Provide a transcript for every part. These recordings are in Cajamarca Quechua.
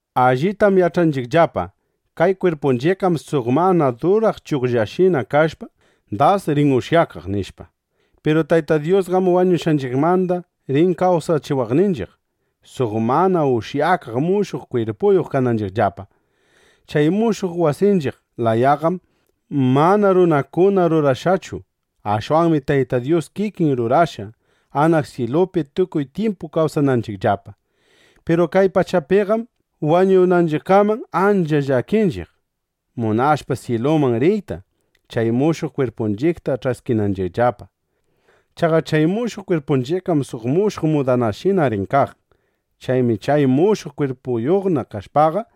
Allitam yach'anchiqllapa: Kay kwirpunchiqqam suq mana duraq chugllashina kashpa, das rin ushyakaq, nishpa. Piru Tayta Dyusqam wañushqanchiqmanda rin kawsachiwaqninchiq, suq mana ushyakaq mushuq kwirpuyuq kananchiqllapa. Chay mushuq wasinchiq layaqam mana runakuna rurashqanchu. Ashwanmi Tayta Dyus kikin rurashqa, anaq syilupi tukuy tyimpu kawsananchiqllapa. Piru kay pachapiqam wañunanchiqkaman ancha llakinchiq, munashpa syiluman riyta, chay mushuq kwirpunchiqta ch'askinanchiqllapa. Chaqa chay mushuq kwirpunchiqqam suq mushuq mudanashina rin kaq. Chaymi chay mushuq kwirpuyuqna kashpaqa,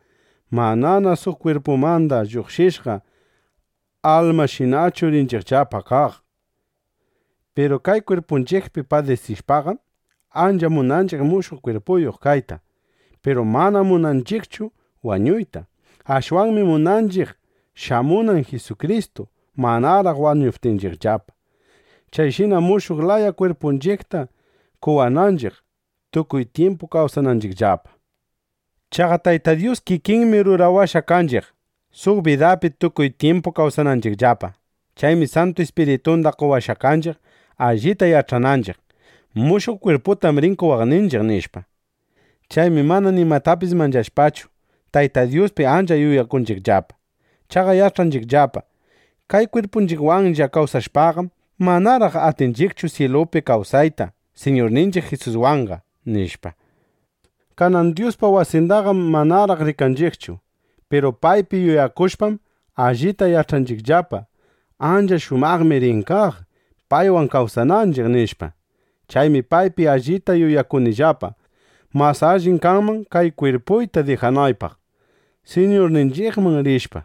manana suq kwirpumanda lluqshishqa almashinachu rinchiqllapa kaq. Piru kay kwirpunchiqpi padisishpaqam, ancha munanchiq mushuq kwirpuyuq kayta. Piru manam munanchiqchu wañuyta. Ashwanmi munanchiq shamunan Jisukristu, manaraq wañuptinchiqllapa, chayshina mushuq laya kwirpunchiqta qowananchiq, tukuy tyimpu kawsananchiqllapa. Chaqa Tayta Dyus kikinmi rurawashqa kanchiq, suq bidapi tukuy tyimpu kawsananchiqllapa. Chaymi Santu Ispiritunda qowashqa kanchiq, allita yach'ananchiq: Mushuq kwirputam rin qowaqninchiq, nishpa. Chaymi mana nimatapis manchashpachu, Tayta Dyuspi ancha yuyakunchiqllapa. Chaqa yach'anchiqllapa: Kay kwirpunchiqwanlla kawsashpaqam, manaraq atinchiqchu syilupi kawsayta Siñurninchiq Jisuswanqa, nishpa. Kanan Dyuspa wasindaqam manaraq rikanchiqchu. Piru paypi yuyakushpam, allita yach'anillapa: Ancha shumaqmi rin kaq, paywan kawsananchiq, nishpa. Chaymi paypi allita yuyakunillapa: Mas allim kanman kay kwirpuyta dijanaypaq, Siñurninchiqman rishpa,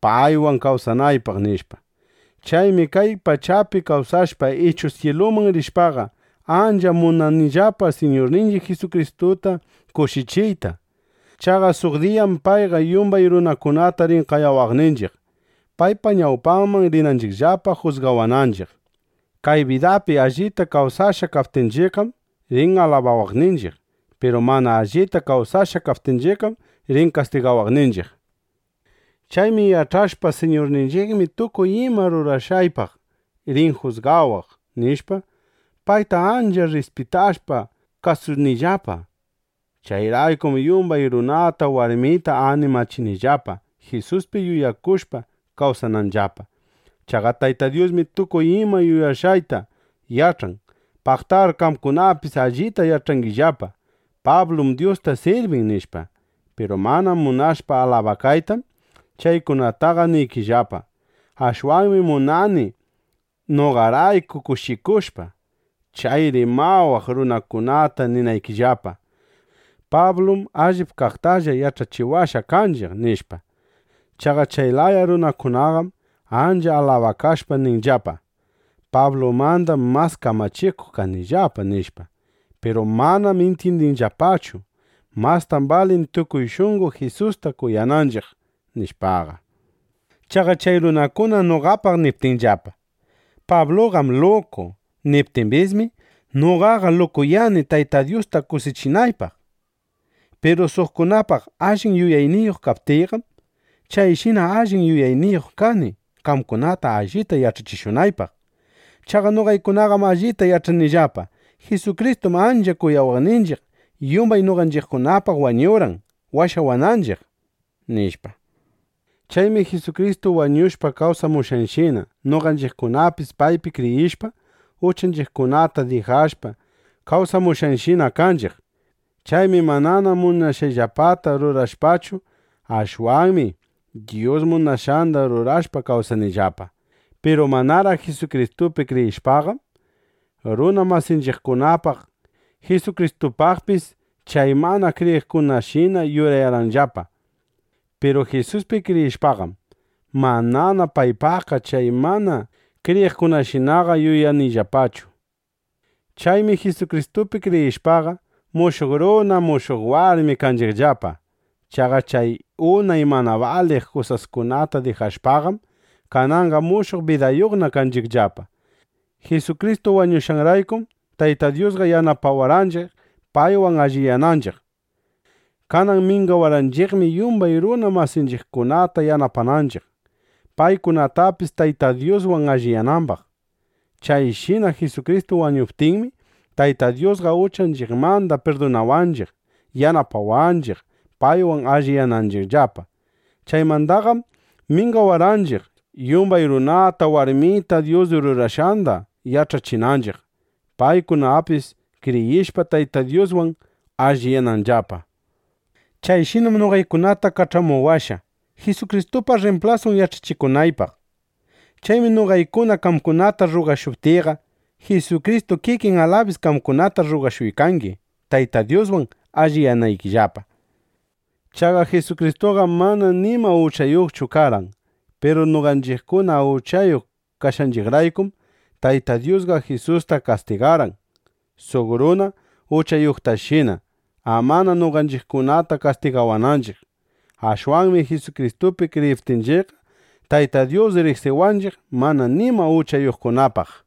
paywan kawsanaypaq, nishpa. Chaymi kay pachapi kawsashpa ichu syiluman rishpaqa, ancha munanillapa Siñurninchiq Jisukristuta kushichiyta. Chaqa suq diyam payqa yumbay runakunata rin qayawaqninchiq, paypa ñawpanman rinanchiqllapa, jusgawananchiq. Kay bidapi allita kawsashqa kaptinchiqqam, rin alabawaqninchiq. Piru mana allita kawsashqa kaptinchiqqam, rin kastigawaqninchiq. Chaymi yach'ashpa: Siñurninchiqmi tukuy ima rurashqaypaq rin jusgawaq, nishpa, payta ancha rrispitashpa, kasunillapa. Chayraykum yumbay runata, warmita animachinillapa, Jisuspi yuyakushpa kawsananllapa. Chaqa Tayta Dyusmi tukuy ima yuyashqayta yach'an. Paqtar qamkunapis allita yach'angillapa: Pablum Dyusta sirbin, nishpa. Piru mana munashpa alabakaytam, chaykunataqa niykillapa. Ashwanmi munani noqarayku kushikushpa, chay rimawaq runakunata ninaykillapa: “Pablum allip kaqtalla yach'achiwashqa kanchiq”, nishpa. Chaqa chay laya runakunaqam ancha alabakashpa ninllapa: “Pablumandam mas kamachikuq kanillapa”, nishpa. Piru manam intyindinllapachu: Mastam balin tukuy shunqo Jisusta kuyananchiq, nishpaqa. Chaqa chay runakuna noqapaq niptinllapa: “Pabluqam luku”, niptimbismi, noqaqa “lukuyani” Tayta Dyusta kushichinaypaq. Piru suqkunapaq allin yuyayniyuq kaptiyqam, chayshina allin yuyayniyuq kani, qamkunata allita yach'achishunaypaq. Chaqa noqaykunaqam allita yach'anillapa: Jisukristum ancha kuyawaqninchiq, yumbay noqanchiqkunapaq wañurqan, washawananchiq, nishpa. Chaymi Jisukristu wañushpa kawsamushqanshina, noqanchiqkunapis paypi kriyishpa, uchanchiqkunata dijashpa, kawsamushqashina kanchiq. Chaymi manana munashqayllapata rurashpachu, ashwanmi Dyus munashqanda rurashpa kawsanillapa. Piru manaraq Jisukristupi kriyishpaqam, runa masinchiqkunapaq, Jisukristupaqpis chay mana kriyiqkunashina yuyarqayllapa. Piru Jisuspi kriyishpaqam, manana paypaqqa chay mana kriyiqkunashinaqa yuyanillapachu. Chaymi Jisukristupi kriyishpaqa, mushuq runa, mushuq warmina kanchiqllapa. Chaqa chay unay mana baliq kusaskunata dijashpaqam, kananqa mushuq bidayuqna kanchiqllapa. Jisukristu wañushqanraykum, Taytan Dyusqa yanapawarqanchiq, paywan alliyananchiq. Kanan mingawarqanchiqmi, yumbay runa masinchiqkunata yanapananchiq, paykunapis Tayta Dyuswan alliyanambaq. Chayshina Jisukristu wañuptinmi, Taytan Dyusqa uchanchiqmanda pirdunawaqninchiq, yanapawarqanchiq, paywan alliyananchiqllapa. Chaymandaqam mingawarqanchiq, yumbay runata warmita Dyus rurashqanda yach'achinanchiq, paykunapis kriyishpa, Tayta Dyuswan alliyananllapa. Chayshinam noqaykunata kach'amuwashqa, Jisukristupa rrimplasun yach'achikunaypaq. Chaymi noqaykuna qamkunata rrugashuptiyqa, Jisukristu kikin alabis qamkunata rrugashuykangi, Tayta Dyuswan alliyanaykillapa. Chaqa Jisukristuqam mana nima uchayuqchu karqan. Piru noqanchiqkuna uchayuq kashqanchiqraykum, Tayta Dyusqa Jisusta kastigarqan suq runa uchayuqtashina, amana noqanchiqkunata kastigawananchiq. Ashwanmi Jisukristupi kriyiptinchiqqa, Tayta Dyus riqsiwanchiq mana nima uchayuqkunapaq.